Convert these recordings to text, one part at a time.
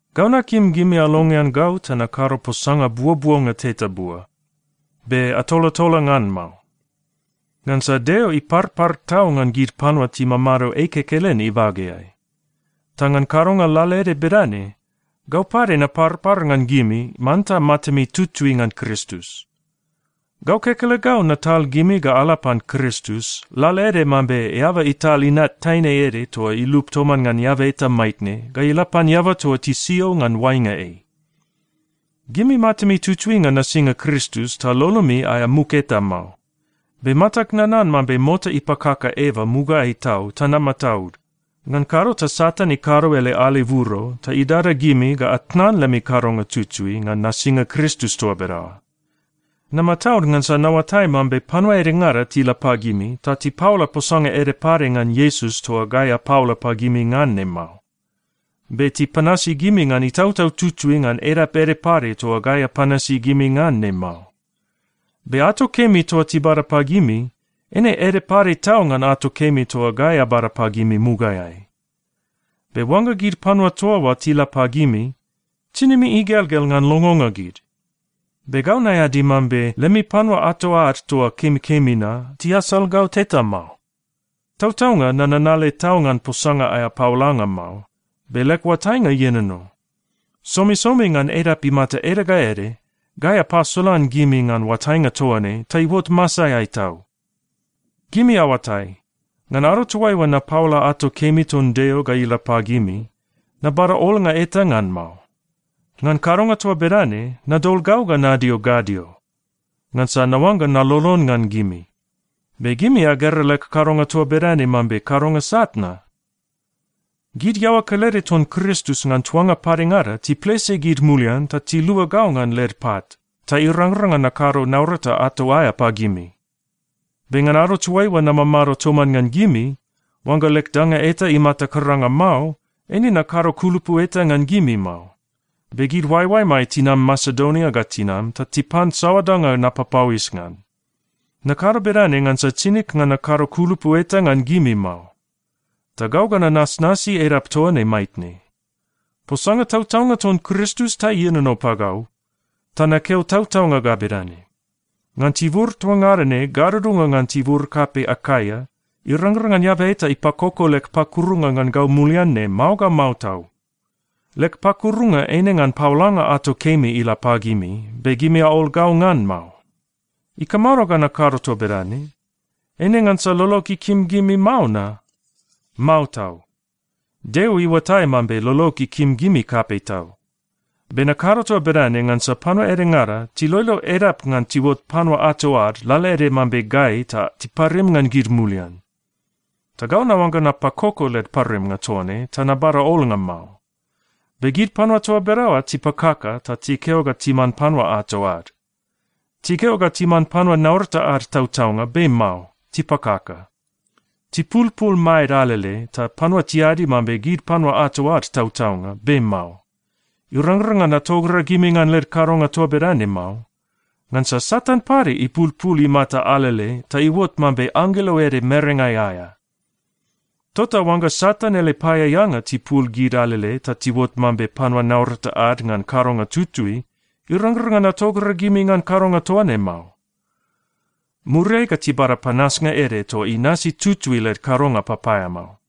Gau nakim gimi alongean gau ta nakado posanga buobuonga teta bua. Be atolatola ngan mao. Ngansa Deo iparpar tau ngan gid panua timamado ei kekelen ibageai. Ta ngan kadonga lalaede bedane, gau pade naparpar ngan gimi manta matami tutui ngan Kristus. Gau kekelegau natal gimi ga ala pan Kristus, lalaede mambe eaba ital inat taine ede toa ilup toman ngan eaba eta maitne ga ila pan eaba toa tisio ngan oainga ei. Gimi matami tutui ngan nasinga Kristus ta lolomi aea muk eta mao. Be matag nanan mambe mota ipakaka Eva mugaeai tau, ta namataud. Ngan kado ta Satan ikado ele aleburo ta idada gimi ga atnan lemi kadonga tutui ngan nasinga Kristus toa bedaoa. Namataud ngansa naoatai mambe panua edengada tila pagimi ta tipaola posanga ede pade ngan Iesus toa gai apaola pagimi ngan ne mao. Be tipanasi gimi ngan Itautau Tutui ngan edap ede pade toa gai apanasi gimi ngan ne mao. Be ato kemi toa tibada pagimi, eine ede pade tau ngan ato kemi toa gai abada pagimi mugaeai. Be oangga gid panua toa oa tila pagimi, tinimi igelgel ngan longonga gid. Be gau naeadi mambe lemi panua ato ad toa kemikemi na tiasal gau teta mao. Tautaunga nananale tau ngan posanga aea paolanga mao, be leg oatainga ienono. Somisomi ngan edap imata ede ga ede, gai apasolan gimi ngan oatainga toa ne ta iuot masaeai tau. Gimi aoatai, ngan ado toaiua napaola ato kemi ton Deo ga ila pagimi, nabada olnga eta ngan mao. Ngan kadonga toa bedane, nadol gau ga nadio gadio, ngansa naoangga nalolon ngan gimi. Be gimi agera leg kadonga toa bedane mambe kadonga sat na? Gid iaoa kelede ton Kristus ngan tuanga padengada tiplese gid mulian ta tilua gau ngan led pat, ta irangrang ngan nakado naurata ato aea pagimi. Be ngan ado toaiua namamado toman ngan gimi, oangga leg danga eta imata karanga mao, eine nakado kulupu eta ngan gimi mao. Be gid oaeoaemai tinam Masedonia ga tinam ta tipan saoa danga napapauis ngan. Nakado bedane ngansa tinig ngan nakado kulupu eta ngan gimi mao. Ta gau ga nanasnasi edap toa ne maitne. Posanga tautaunga ton Kristus ta ienono pagau, ta nakeo tautaunga ga bedane: Ngan tibur toa ngada ne gadudunga ngan tibur kapei Akaia, irangrang ngan eaba eta ipakoko leg pakurunga ngan gau mulian ne mao ga mao tau. Leg pakurunga eine ngan paolanga ato kemi ila pagimi, be gimi aol gau ngan mao. Ikamado ga nakado toa bedane? Eine ngansa lolog ikim gimi mao na? Mao tau! Deo iuatai mambe lolog ikim gimi kapei tau. Be nakado toa bedane ngansa panua edengada tiloilo edap ngan tiuot panua ato ad lalaede mambe gai ta tiparim ngan gid mulian. Ta gau naoangga napakoko led parimnga toa ne ta nabada olnga mao. Be gid panua toa bedaoa tipakaka ta tikeo ga timan panua ato ad. Tikeo ga timan panua naurata ad tautaunga, be mao. Tipakaka. Tipulpul maed alele, ta panua tiadi mambe gid panua ato ad tautaunga. Be mao. Irangrang ngan atogragimi ngan led kadonga toa bedane mao. Ngansa Satan pade ipulpul imata alele ta iuot mambe anggelo ede merengai aea. Tota oangga Satan ele paeaeanga tipul gid alele ta tiuot mambe panua naurata ad ngan kadonga tutui, irangrang ngan atogragimi ngan kadonga toa ne mao. Muriai ga tibada panasnga ede toa inasi tutui led kadonga papaeamao.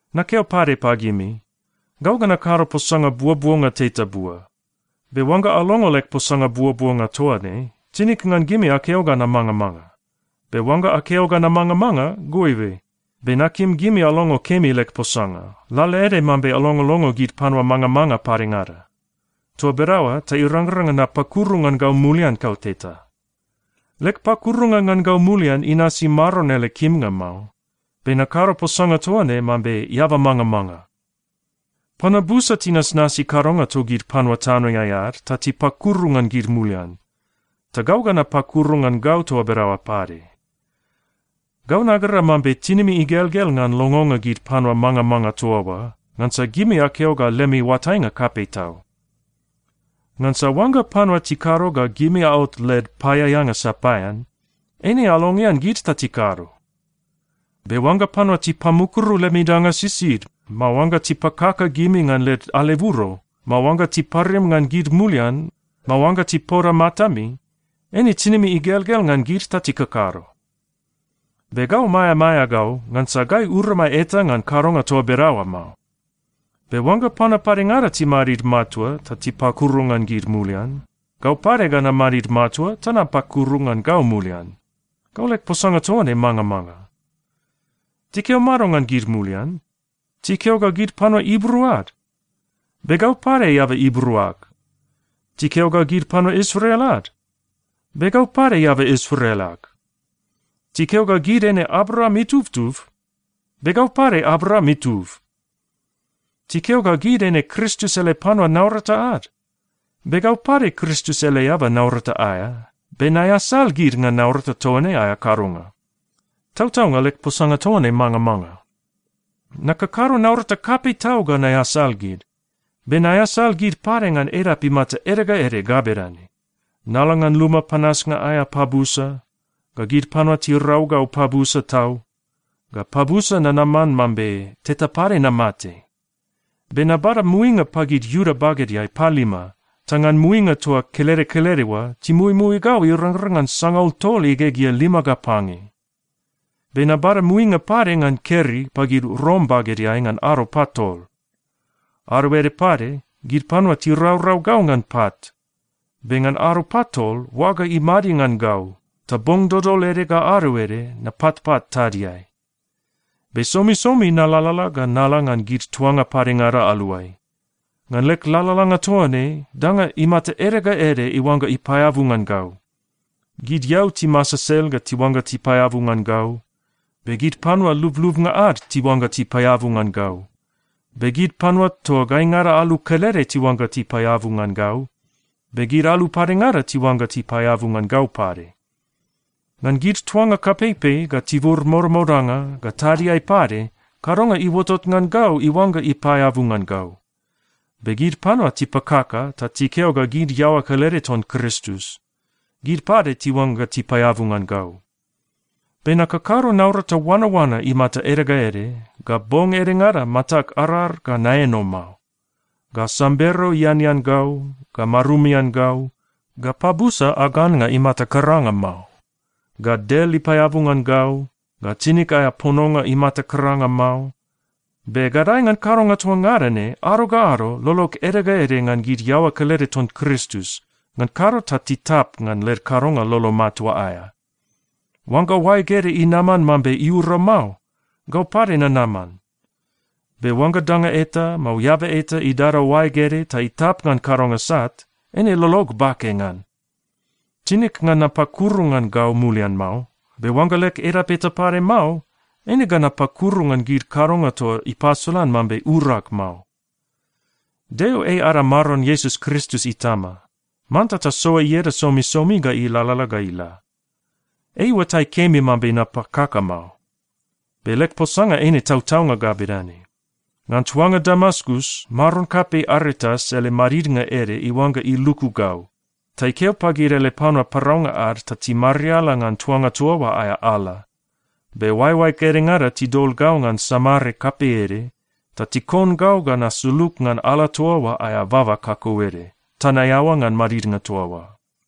Nakeo pade pagimi, gau ga nakado posanga buobuonga teta bua. Be oangga alongo leg posanga buobuonga toa ne, tinig ngan gimi akeo ga namangamanga. Be oangga akeo ga namangamanga, goibe. Be nakim gimi alongo kemi leg posanga, lalaede mambe alongolongo gid panua mangamanga padengada. Toa bedaoa ta irangrang ngan napakuru ngan gau mulian kauteta. Leg pakurunga ngan gau mulian inasi Maron ele kimnga mao, be nakado posanga toa ne mambe eaba mangamanga. Panua busa tinasnasi kadonga togid panua tanoeai ad ta tipakuru ngan gid mulian, ta gau ga napakuru ngan gau toa bedaoa pade. Gau nagera mambe tinimi igelgel ngan longonga gid panua mangamanga toa oa, ngansa gimi akeo ga lemi oatainga kapei tau. Ngansa oangga panua tikado ga gimi aot led paeaeanga sapaean, eine alongean gid ta tikado. Be oangga panua tipamukuru lemi danga sisid, mao oangga tipakaka gimi ngan led aleburo, mao oangga tiparim ngan gid mulian, mao oangga tipoda matami, eine tinimi igelgel ngan gid ta tikakado! Be gau maeamaea gau ngansa gai uramai eta ngan kadonga toa bedaoa mao. Be oangga panua padengada timadid matua ta tipakuru ngan gid mulian, gau pade ga namadid matua ta napakuru ngan gau mulian. (Gau leg posanga toa ne mangamanga.) Tikeo mado ngan gid mulian? Tikeo ga gid panua Ibru ad? Be gau pade eaba Ibru ag. Tikeo ga gid panua Israel ad? Be gau pade eaba Israel ag. Tikeo ga gid eine Abraam itubtub? Be gau pade Abraam itub. Tikeo ga gid eine Kristus ele panua naurata ad? Be gau pade Kristus ele eaba naurata aea, be naeasal gid ngan naurata toa ne aea kadonga. (Tautaunga, leg posanga toa ne mangamanga.) Nakakado naurata kapei tau ga naeasal gid. Be naeasal gid pade ngan edap imata ede ga ede ga bedane: nala ngan luma panasnga aea pabusa, ga gid panua tirau gau pabusa tau, ga pabusa nanaman mambe teta pade namate. Be nabada muinga pagid Iuda bagedeai palima, ta ngan muinga toa kelede kelede oa timuimui gau irangrang ngan sangaul tol igegea lima ga pange. Be nabada muinga pade ngan keri pagid Rom bagedeai ngan ado patol. Ado ede pade gid panua tiraurau gau ngan pat. Be ngan ado patol, oaga imadi ngan gau. Ta bong dodol ede ga ado ede napatpat tadiai. Be somisomi nalalala ga nala ngan gid tuanga padengada aluai. Ngan leg lalalanga toa ne danga imata ede ga ede iuangga ipaeabu ngan gau. Gid eau timasesel ga tiuangga tipaeabu ngan gau, be gid panua lublubnga ad tiuangga tipaeabu ngan gau, be gid panua toa gaingada alu kelede tiuangga tipaeabu ngan gau, be gid alu padengada tiuangga tipaeabu ngan gau pade. Ngan gid tuanga kapeipei, ga tibur modamodanga, ga tadiai pade, kadonga iuotot ngan gau iuangga ipaeabu ngan gau. Be gid panua tipakaka ta tikeo ga gid iaoa kelede ton Kristus, gid pade tiuangga tipaeabu ngan gau. Be nakakado naurata oanaoana imata ede ga ede, ga bong edengada matag arar ga naeno mao, ga sambero ianean gau, ga marumian gau, ga pabusa ag annga imata karanga mao, ga del ipaeabu ngan gau, ga tinig aea pononga imata karanga mao. Be gadae ngan kadonga toa ngada ne ado ga ado, lolog ede ga ede ngan gid iaoa kelede ton Kristus, ngan kado ta titap ngan led kadonga lolo matua aea. Oangga oaeg ede inaman mambe iura mao, gau pade nanaman. Be oangga danga eta, mao eaba eta idada oaeg ede ta itap ngan kadonga sat, eine lolog bake ngan. Tinig ngan napakuru ngan gau mulian mao, be oangga leg edap eta pade mao, eine ga napakuru ngan gid kadonga toa ipasolan mambe urag mao. Deo ei ada Maron Iesus Kristus Itama. Manta tasoa ieda somisomi ga ilalala ga ila. Ei iuatai kemi mambe napakaka mao, be leg posanga eine tautaunga ga bedane: Ngan tuanga Damaskus, maron kapei Aretas ele madidnga ede iuangga iluku gau, ta ikeo pagid ele panua paraunga ad ta timariala ngan tuanga toa oa aea ala. Be oaeoaeg edengada tidol gau ngan samare kapei ede ta tikon gau ga nasulug ngan ala toa oa aea baba kakauede, ta naeaoa ngan madidnga toa oa.